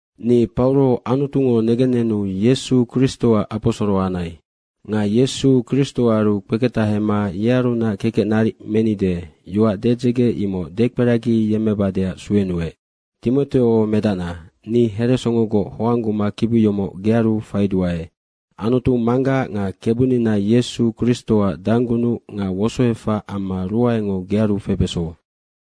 Ni Pauro Anutungo negennenu Yesu Kristoac aposoro anai. Nga Yesu Kristoaru kpeketahema yearunac kekec naric menide, yoac dedzege imoc dekperagiyemmebadeac suenuec. Timoteo medacna, ni heresongogoc hoangguma kibi yomoc gearu faiduae. Anutu Manggac nga Kebunina Yesu Kristoac danggunuc nga wosoefac amma ruaengo gearu febeso.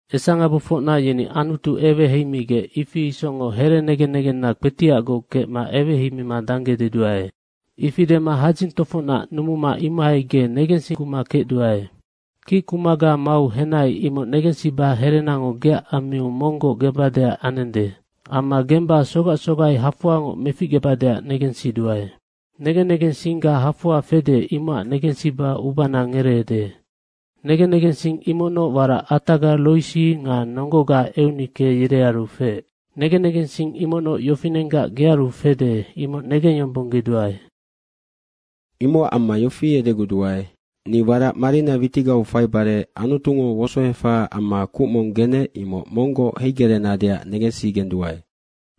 Esangabofocna yeni Anutu eweheimigec, ifi isocngoc herenegen negenna kpetiacgoc kecma eweheimima dangge deduae. Ifi dema hadzing tofocnac numuma imohai ge negensiguma kecduae. Kickumaga mau henai, imoc negensiba herenango geac ammiu monggoc gembadeac anende. Amma gemma sogac sogai hafoangoc meficgebadeac negensiduae. Negen negensingga hafoa fede, imocac negensiba ubana ngereede. Negen negensing imocnoc warac ataga Roisi nga nonggoga Eunike, yerearu feec. Negen negensing imocnoc yofinenggac gearu fede, imoc negengyombonggeduae. Imocac amma yofi edeguduae, ni warac marina witigau faibare Anutungo wosoefahaac amma kuc mong genec, imoc monggoc heigereenadeac negensigenduae.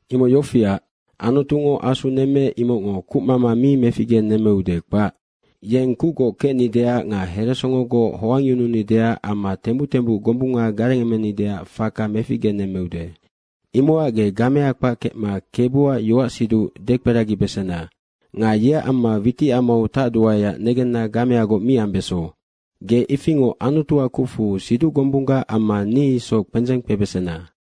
Imoc yofiac, Anutungo Asu nemmeec, imocngo kucmama mi meficgenemmeude, kpac. Yeng kucgoc kecnideac nga heresongogoc hoangyununideac amma tembuc tembuc gombunga garengemenideac faka meficgenemmeude. Imocac ge gamea kpac kecma Kebuac yoacsiduc dekperagibesena. Nga yeac amma witicamau tacduaeac negenna gameagoc mi ambeso. Ge ifingoc Anutuac kucfu siduc gombunggac amma ni isoc kpendzeng kpebesena.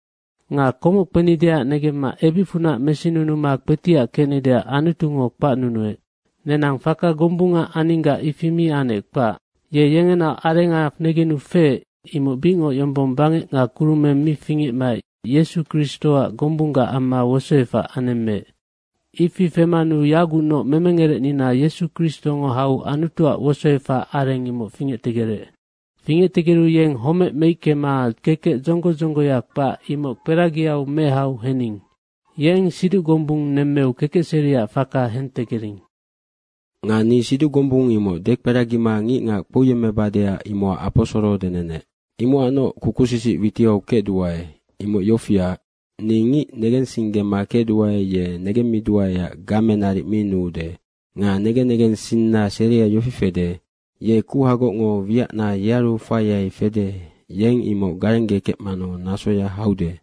Nga komoc kpenideac negemma ebicfunac mesinunuma kpetiac kecnideac Anutungo kpacnunuec. Nenang faka gombunga aninggac ifi mi anec, kpac. Ye yengenaoc arenga negenu feec, imoc bicngoc yombong bangec nga kurumeng mi fingecmaec Yesu Kristoac gombunggac amma wosoefac anemmeec. Ifi femanu yagucnoc memengerecnina Yesu Kristongo hau Anutuac wosoefac areng imoc fingectegerec. Fingectegeru yeng homec meickema kekec dzonggo dzonggoya kpac, imoc kperagiau mehau hening. Yeng siduc gombung nemmeu kekecseriac faka hentegering. Nga ni siduc gombung imoc dekperagima ngicngac kpouyemmebadeac imocac aposoro denenec. Imocacnoc kukusisic witiau kecduae. Imoc yofiac, ni ngic negensinggema kecduae, ye negemmiduaeac game naric mi nuude. Nga negen negensina seria yofi fede. Ye kuhagocngo wiacna yearu faiai fede, yeng imoc garenggekecmanu nasoya haude.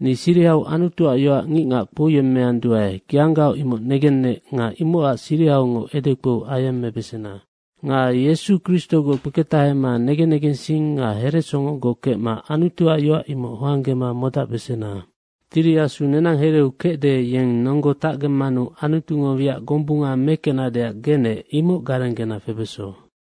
Ni sirihau Anutuac yoac ngicngac kpouyemmeanduae, geanggaoc imoc negenec nga imocac sirihaungoc edekpou ayemmebesena. Nga Yesu Kristogoc kpeketahema negen negensing nga heresongogoc kecma Anutuac yoac imoc hoanggema modacbesena. Tiri Asu nenang hereu kecde, yeng nonggo tacgemmanu Anutungo wiac gombunga mekecnadeac genec, imoc garenggena febeso.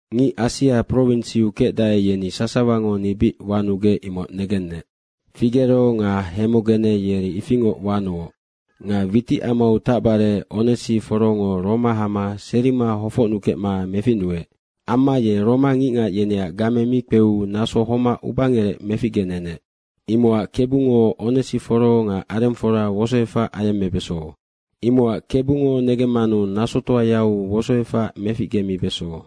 Ngic Asia prowinsiu kecdae, yeni sasawango ni bic wanugec, imoc negennec. Figero nga Hemogene yeri ifingoc wanuoc. Nga witicamau tacbare Onesiforongo Roma hama serima hofocnukecma meficnuec. Amma ye Roma ngicngac yeneac game mi kpeu naso homac ubangerec meficgenenec. Imocac Kebungo Onesiforo nga arengfora wosoefac ayemmebeso. Imocac Kebungo negemmanu nasotoayau wosoefac meficgemibeso.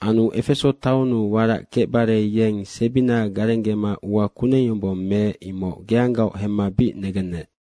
Anu Efeso taonnu warac kecbare yeng sebina garenggema ua kuneng yombong meec, imoc geanggaoc hemma bic negennec.